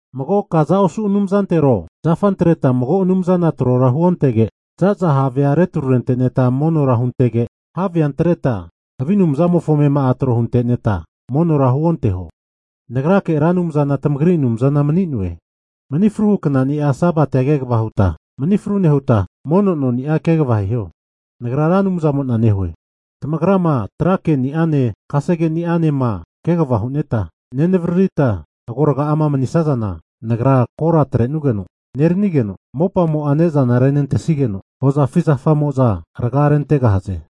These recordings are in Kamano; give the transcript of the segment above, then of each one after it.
Mago kaza osu anumzantero, zafa antreta mago anumzana trora huontege, zaza havea retrurente'neta monora huntege, havea antreta havi anumzamofo amema'a tro hunte'neta monora huonteho. Nagrake Ra Anumzana tamagri Anumzana mani'noe. Mani fruhu knani'a Sabatia kegava huta manifru nehuta, mono noni'a kegava hiho. Nagra Ra Anumzamona nehue. Tamagrama tra keni'ane kasegeni'ama kegava hu'neta nevaririta agorga'ama manisazana, Nagra kora atre'nugeno neranigeno, mopamo'a ne'zana renentesigeno, hozafi zafamo'za raga'a rentegahaze.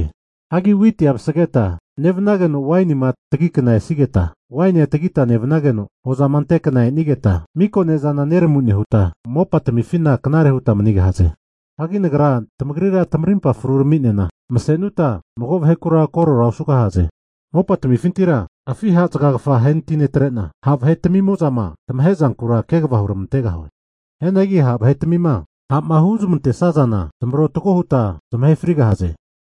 Hagi witia vasageta nevanageno wainima tagi kna esigeta, wainia tagita nevanageno, hozama ante kna e'nigeta, miko ne'zana neramu nehuta mopatamifina knare huta manigahaze. Hagi Nagra tamagrira tamarimpa fru tami'nena, masenuta mago vahekura korora osugahaze. Mopatamifintira afi ha' zagagafa ahenatinetre'na, ha' vahetamimo'za tamahe zankura kegava huramantegahue. Hianagi ha' vahetamima ha'ma huzmantesazana, zamarotago huta zamahe frigahaze.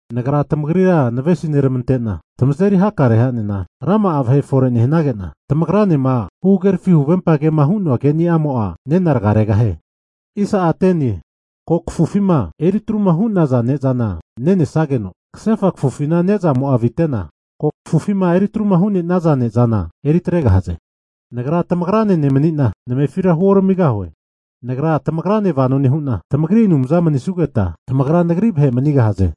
Nagra tamagrira navesineramante'na tamazeri hakare ha'nena rama'a vahe fore nehanagena tamagranema huhagerafi huvempa kema hu'noa keni'amo'a nena raga regahie. Hagi ko kafufima eritruma hu'naza ne'zana nenesageno, kasefa kafufina ne'zamo'a avitena, ko kafufima eritru hu'nenaza ne'zana eritregahaze. Nagra tamagrane nemanina, namefira huoramigahue. Nagra tamagrane vano nehu'na, tamagri Anumza mani'nesugeta, tamagra Nagri vahe manigahze.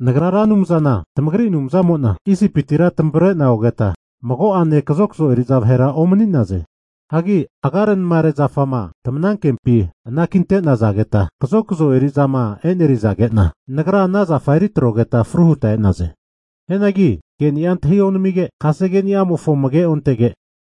Nagra Ra Anumzana, tamagri Anumzamo'na Isipiti'ma tamavre'na ogeta, mago'ane kazokzo eri'za vahera omani'naze. Hagi agarenamare zafama tamanankempi anakinte'nazageta kazokzo eri'zama e'nerizage'na, Nagra ana zafa eri atrogeta fru huta e'naze. Hianagi keni'a antahi onamige, kasegeni'amofo amage ontege,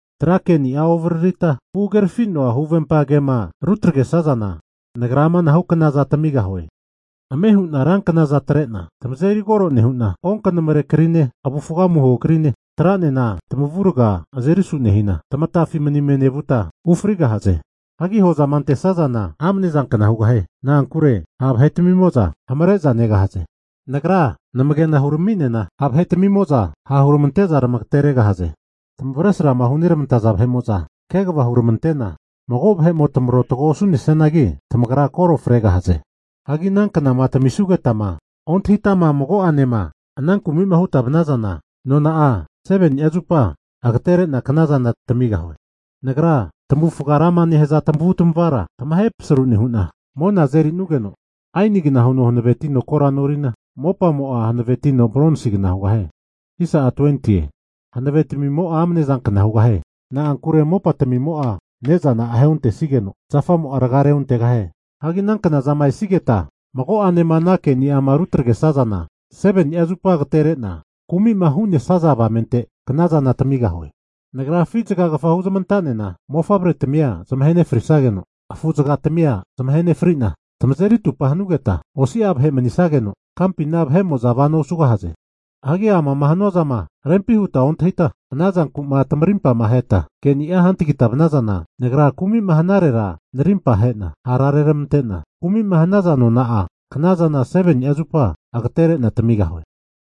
tra keni'a ovaririta, huhagerafino'a huvempa ke'ma rutagresazana, Nagra amanahu knaza tamigahue. Ame hu'na ranknaza atre'na, tamazeri kore nehu'na, onkanamre krine, avufga amuho krine atranena tamavurga azeri asu nehina, tamatafi manime nevuta ufrigahaze. Hagi hozama antesazana amne zankna hugahie. Na'ankure ha' vahetamimo'za hamare'za negahaze. Nagra namage'na hurami'nena ha' vahetamimo'za hara huramagateregahaze. Tamavesrama hunermantaza vahe'mo'za kegava hunermante'na, mago vahe'mo tamarotago osu'nesianagi, tamagra kore fregahaze. Hagi ana knazama tamisugetama ontahitama mago'anema ana kumima huta vanazana, nona'a 7ni'a zupa agaterena knazana tamigahue. Nagra tamavufga rama nehaza tamavutamavara tamahe pasaru nehu'na, mona azeri'nugeno aenigna huno hanavetino kora norina, mopamo'a hanavetino bronsigna hugahie. Hanavetamimo'a amane zanka hugahie. Na'ankure mopatamimo'a ne'zana ahe ontesigeno, zafamo'a raga reontegahie. Hagi ana knazama esigeta mago'anema ana keni'ama rutagresazana, Nagra 7ni'a zupa agatere'na kumi'ma hu'nesaza avamente knazana tamigahue. Nagra afi zagagafa huzmanta'nena mofavretamia zamahe nefrisageno, afu zagatamia zamahe nefrina, tamazeri atupa hanugeta, osia vahe manisageno, kampina vahe'mo'za vano osugahaze. Hagi ana'ma hanua zama rempi hutama ontahita, ana zanku'ma tamarimpama aheta keni'a hantagita vanazana, Nagra kumi'ma hanarera narimpa ahe'na hara reramante'na, kumi'ma hanaza nona'a knazana 7ni'a zupa agatere'na tamigahue.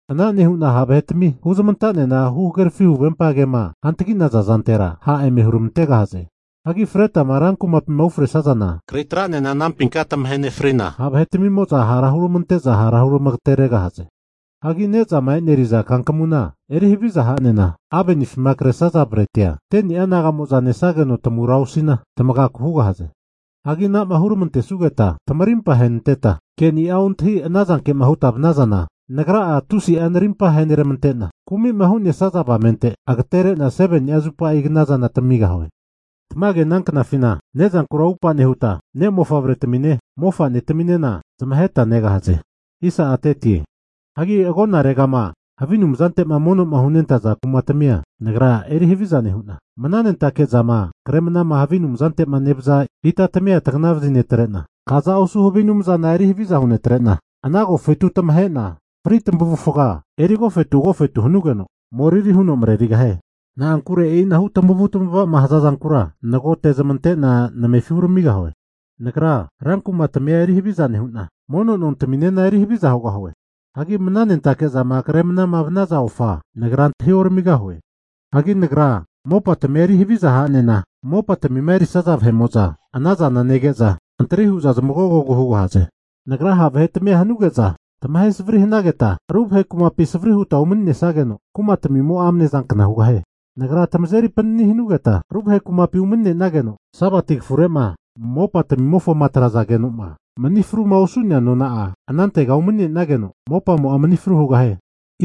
Ana nehu'na ha' vahetami huzamanta'nena huhagerafi huvempa ke'ma hantagi'naza zantera ha' eme huramantegahaze. Hagi fretama rankumapima ufresazana, kri atra'nena anampinka tamahe nefrina, ha' vahetamimoza hara hurmante'za hara huramagateregahaze. Hagi ne'zama e'neri'za kankamuna eri havizama ha'nena avenifima kresaza bretia 10'a naga'mo'za nesageno tamura osina tamagaku hugahaze. Hagi ana'ma huramantesugeta, tamarimpa ahenanteta, kenia ontahi ana zanke'ma huta vanazana, Nagra tusi'a narimpa aheneramante'na, kumi'ma hu'nesaza avamente, agatere'na 7ni'a zupa knazana tamigahue. Tamage ana knafina, ne'zankura atupa nehuta ne' mofavre tami'ne mofa'netaminena zamaheta negahaze. Hagi agonaregama havi anumzante'ma mono'ma hunentaza kumatamia Nagra eri haviza nehu'na, mnanentake zama kre mnama kaza osu havi anumzante'ma nevaza ita tamia tagnavazi netre'na, kaza osu havi anumzana, eri haviza huntene'na ana agofetu tamahe'na fri tamavufga eri agofetu agofetu hanugeno moriri huno marerigahie. Na'ankure e'inahu tamavutavama hazazankura nagote'zmante'na namefi huramigahue. Nagra rankumatamia eri haviza nehu'na, mono nontaminena eri haviza hugahie. Hagi mnanentake zama kre mnama vnaza ofa, Nagra antahi oramigahue. Hagi nagra mopatamia eri haviza ha'nena, mopatamima erisaza vahe'mo'za anazana nege'za, antri hu'za zmagogogu hugahaze. Nagra ha' vahetamia hanuge'za tamahe savri hanageta, ru vahe kumapi savri huta umanisageno, kumatamimo'a amne zankna hugahie. Nagra tamazeri panini hanugeta ru vahe kumapi umani'nenageno, Sabati kafurema mopatamimofoma atrazage'noma mani fruma osu'nea nona'a anantega umani'nenageno mopamo'a mani fru hugahie.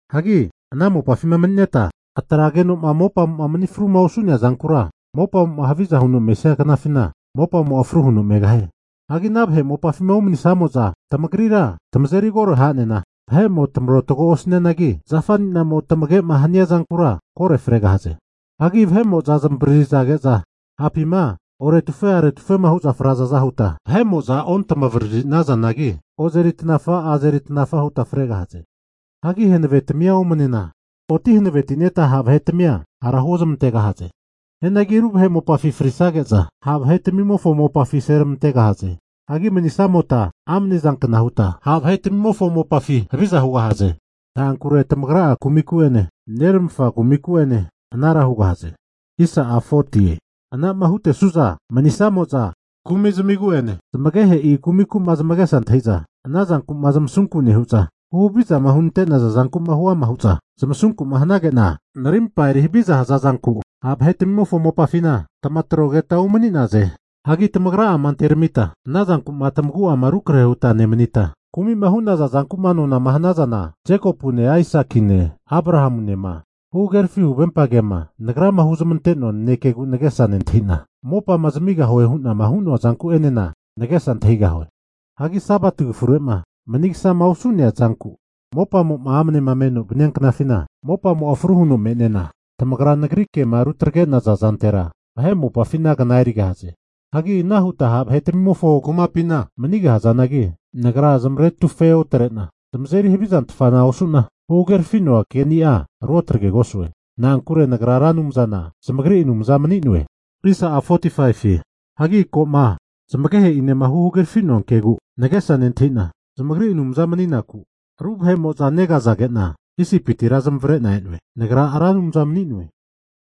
Hagi ana mopafima mani'neta atrageno'ma mopamo'ma mani fruma osu'nea zankura mopamo'ma haviza huno mesia knafina, mopamo'a fru huno megahie. Hagi ana vahe mopafima umanisamo'za tamagrira tamazeri kore ha'nena, vahe'mo tamarotago osanianagi, zafaninamo tamage'ma hania zankura kore fregahaze. Ha vahe'mo'za zamavaririzage'za ha'pima oretufe aretufema hu'za frazaza huta vahe'mo'za ontamavariri nazanagi ozeri tanafa azeri tanafa huta fregahaze. Hagi hanavetamia omnena oti hanavetineta ha' vahetamia hara huozmantegahaze. Hianagi ru vahe mopafi frisage'za, ha' vahetamimofo mopafi aseramantegahaze. Hagi manisamota amane zankna huta ha' vahetamimofo mopafi haviza hugahaze. Na'ankure tamagra'a kumiku'ene neramafa kumiku anara hugahaze. Ana'ma hutesu'za manisamo'za kumizmigu'ene zamagehe'i kumiku'ma zamagesa nentahi'za ana zanku'ma zamasuku nehu'za, huhavizama hunante'naza zanku'ma huama hu'za zamasunku'ma hanage'na, Narimpa eri haviza hazazanku ha' vahetamimofo mopafina tamatrogeta umani'naze. Hagi tamagra'ama anteramita ana zanku'ma tamagu'ama rukrahe'ma huta nemanita, kumi'ma hu'naza zankuma nonama hanazana, Jekopune, Aisakine Abrahamunema huhagerafi huvempa kema Nagrama huzmante'noa nanekegu nagesa nentahi'na, mopama zamigahuema hu'noa zanku'enena nagesa antahigahue. Hagi Sabati kafurema manigasama osu'nea zanku mopamo'ma amnema menoma vania knafina mopamo'a fru huno me'nena, tamagra Nagri kema rutagrenaza zantera vahe mopafina kna erigahaze. Hagi ana huta ha' vahetamimofo kumapina manigahazanagi, Nagra zamaretufe otre'na, zamazeri havi zantafana osu'na, huhagerafi'noa keni'a ruotagregosue. Na'ankure Nagra Ra Anumzana, zamagri Anumza mani'noe. Hagi ko'ma zamagehe'inema huhagerafinoa kegu nagesa nentahina, zamagri Anumza mani'naku ru vahe'mo'za negazage'na Isipitira zamavare'na e'noe. Nagra Ra Anumza mani'noe.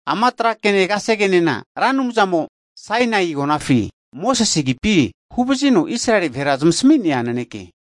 Ama tra kene kasegenena Ra Anumzamo Sainai agonafi Mosese asamigeno Israeli vahera zmasaminia naneke.